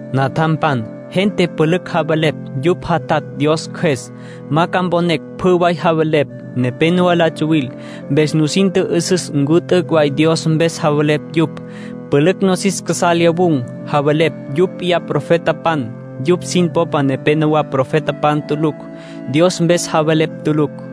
Natjampan, gente pülücj javelepj yupj jatatj Dios Cjües. Ma ca mponé pjü way javelepj. Nepénowa la tsuwil. Mpes nusin tjü'üsüs ncu t'üc' way Dios mpes javelepj yupj. Pülücj nosis casá lyawun̈, javelepj yupj p'iyá profetapan. Yupj sin popa nepenowá profetapan tulucj, Dios mpes javelepj tulucj.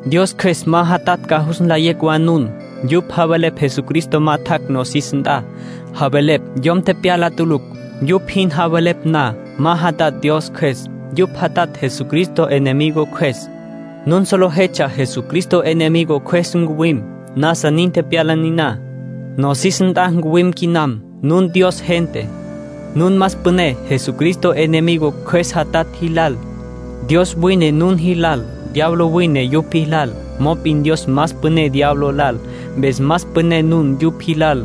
Dios Cjües ma jatatj ca jus nlayé wa nun. Yupj javelepj Jesucristo ma tjac' nosis nt'a, javelepj yom tepyala tulucj. Yupj jin javelepj na, ma jatatj Dios Cjües. Yupj jatatj Jesucristo enemigo cjües. Nun solejetsja Jesucristo enemigo cjües ncuwim. Nasa nin tepyala niná. Nosis nt'a wine quinam. Nun Dios gente. Nun más püné Jesucristo enemigo cjües jatatj jilal. Dios wine nun jilal. Diablo wine yupj jilal. Mop'in Dios más püné diablo lal. Mpes más püné nun yupj jilal.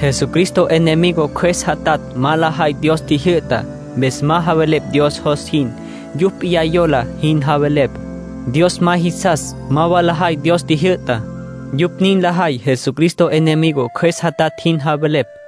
Jesucristo enemigo cjües jatatj ma lajay Dios tjijyü'tá. Mpes ma javelepj Dios jos jin. Yupj p'iyá yola jin javelepj. Dios ma jisas ma wa lajay Dios tjijyü'tá. Yupj nin lajay Jesucristo enemigo cjües jatatj jin javelepj.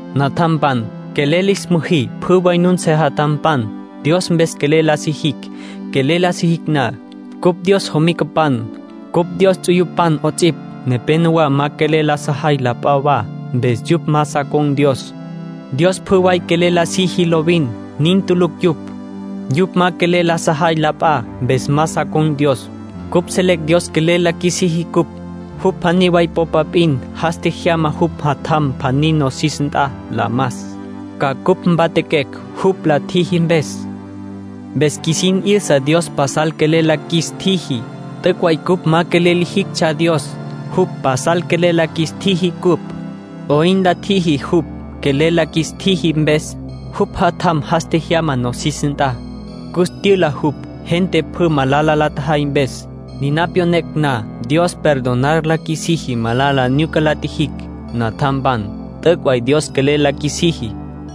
Natjampan, quelel lis müjí pjü way nun sejatjampan. Dios mpes quelel la sijicj. Quelel la sijicj na, cupj Dios jomicapan, cupj Dios ts'uyupan 'ots'ipj. Nepénowa ma quelel la sajay la p'a wa. Mpes yupj ma sa con̈ Dios. Dios pjü way quelel la siji lovin. Nin tulucj yupj. Yupj ma quelel la sajay la p'a. Mpes ma sa con̈ Dios. Cupj selecj Dios quelel la qjuisiji cupj. Jupj pjaní way popa p'in. Jas tjejyama jupj Jatjam pjaní nosis nt'a la mas, ca cupj mpatjaquecj jupj la tjiji mpes. Mpes qjuisin 'yüsa Dios pasal quelel la qjuis tjiji. T'üc' way cupj ma quelel lijictsja Dios. Jupj pasal quelel la qjuis tjiji cupj. ¿'Oyn la tjiji jupj quelel la qjuis tjiji mpes? Jupj Jatjam jas tjejyama nosis nt'a. Cus tyüla jupj, gente pjü malala la tjajay mpes. Niná pyonecj na, Dios perdonar la qjuisiji malala nyuca la tjijicj. Natjampan, t'üc' way Dios quelel la qjuisiji.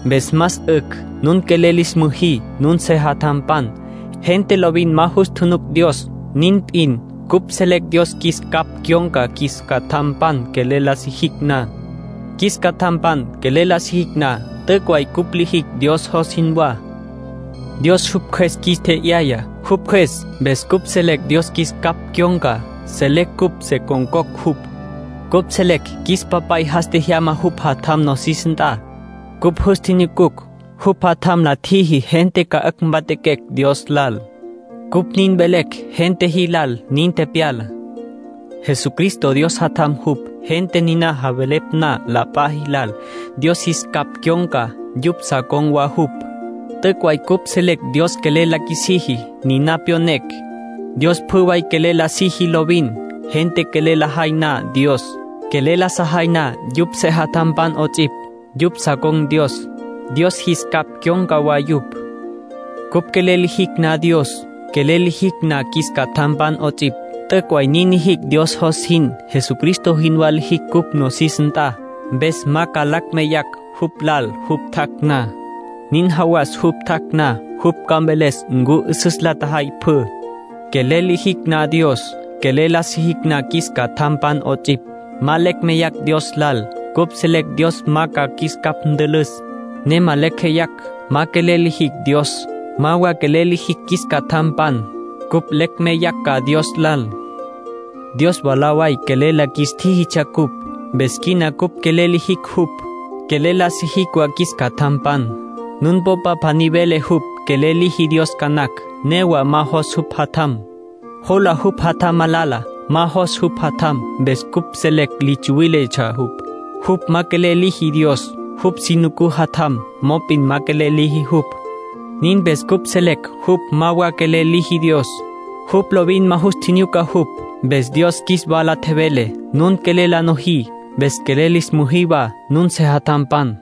Mpes más 'ücj nun quelel lis müjí nun sejatjampan. Gente lovin ma jus tjunuc Dios. Nin p'in cupj selecj Dios qjuis capj cyon̈ca qjuis catjampan quelel la sijicj na. Qjuis catjampan quelel la sijicj na, t'üc' way cupj lijicj Dios jos jinwá. Dios jupj Cjües qjuis tje'yaya. Jupj Cjües mpes cupj selecj Dios qjuis capj cyon̈ca, selecj cupj se con̈cocj jupj. Cupj selecj qjuis Papay jas tjejyama jupj Jatjam nosis nt'a. Cupj jus tjinyucucj. Jupj Jatjam la tjiji gente 'ücj ca mpatjaquecj Dios lal. Cupj nin velecj gente jilal nin tepyalá. Jesucristo Dios Jatjam jupj. Gente niná javelepj na la p'a jilal, Dios jis capj cyon̈ca; yupj sa con̈ wa jupj. T'üc' way cupj selecj Dios quelel la qjuisiji. Niná pyonecj. Dios pjü way quelel la siji lovin. Gente quelel lajay na Dios, quelel la sajay na yupj sejatjampan 'ots'ipj, yupj sa con̈ Dios; Dios jis capj cyon̈ca wa yupj. Cupj quelel lijicj na Dios, quelel lijicj na qjuis catjampan 'ots'ipj, t'üc' way nin lijicj Dios jos jin. Jesucristo jinwá lijicj cupj nosis nt'a, mpes ma ca lecj meyacj jupj lal jupj tjac' na. Nin jawas jupj tjac' na, jupj ca mveles ncu 'üsüs la tjajay pjü. Quelel lijicj na Dios, quelel la sijicj na qjuis catjampan 'ots'ipj, ma lecj meyacj Dios lal. Cupj selecj Dios ma ca qjuis capj ntülüs, ne ma lecj jeyacj. Ma quelel lijicj Dios, ma wa quelel la sijicj qjuis catjampan, cupj lecj meyacj ca Dios lal. Dios mwalá way quelel la qjuis tjíjitsja cupj. Mpes quina cupj quelel lijicj jupj, quelel la sijicj wa qjuis catjampan. Nun popa pjaní vele jupj quelel liji Dios ca nacj. Newa ma jos jupj jatjam; jola jupj jatjam malala. Ma jos jupj jatjam, mpes cupj selecj li tsuwíletsja jupj. Jupj ma quelel liji Dios. Jupj si nucú jatjam, mop'in ma quelel liji jupj. Nin mpes cupj selecj jupj ma wa quelel liji Dios; jupj lovin ma jus tjinyuca jupj. Mpes Dios qjuis wala tjevele: “Nun quelel la nojí. Mpes quelel lis müjí wa nun sejatjampan.”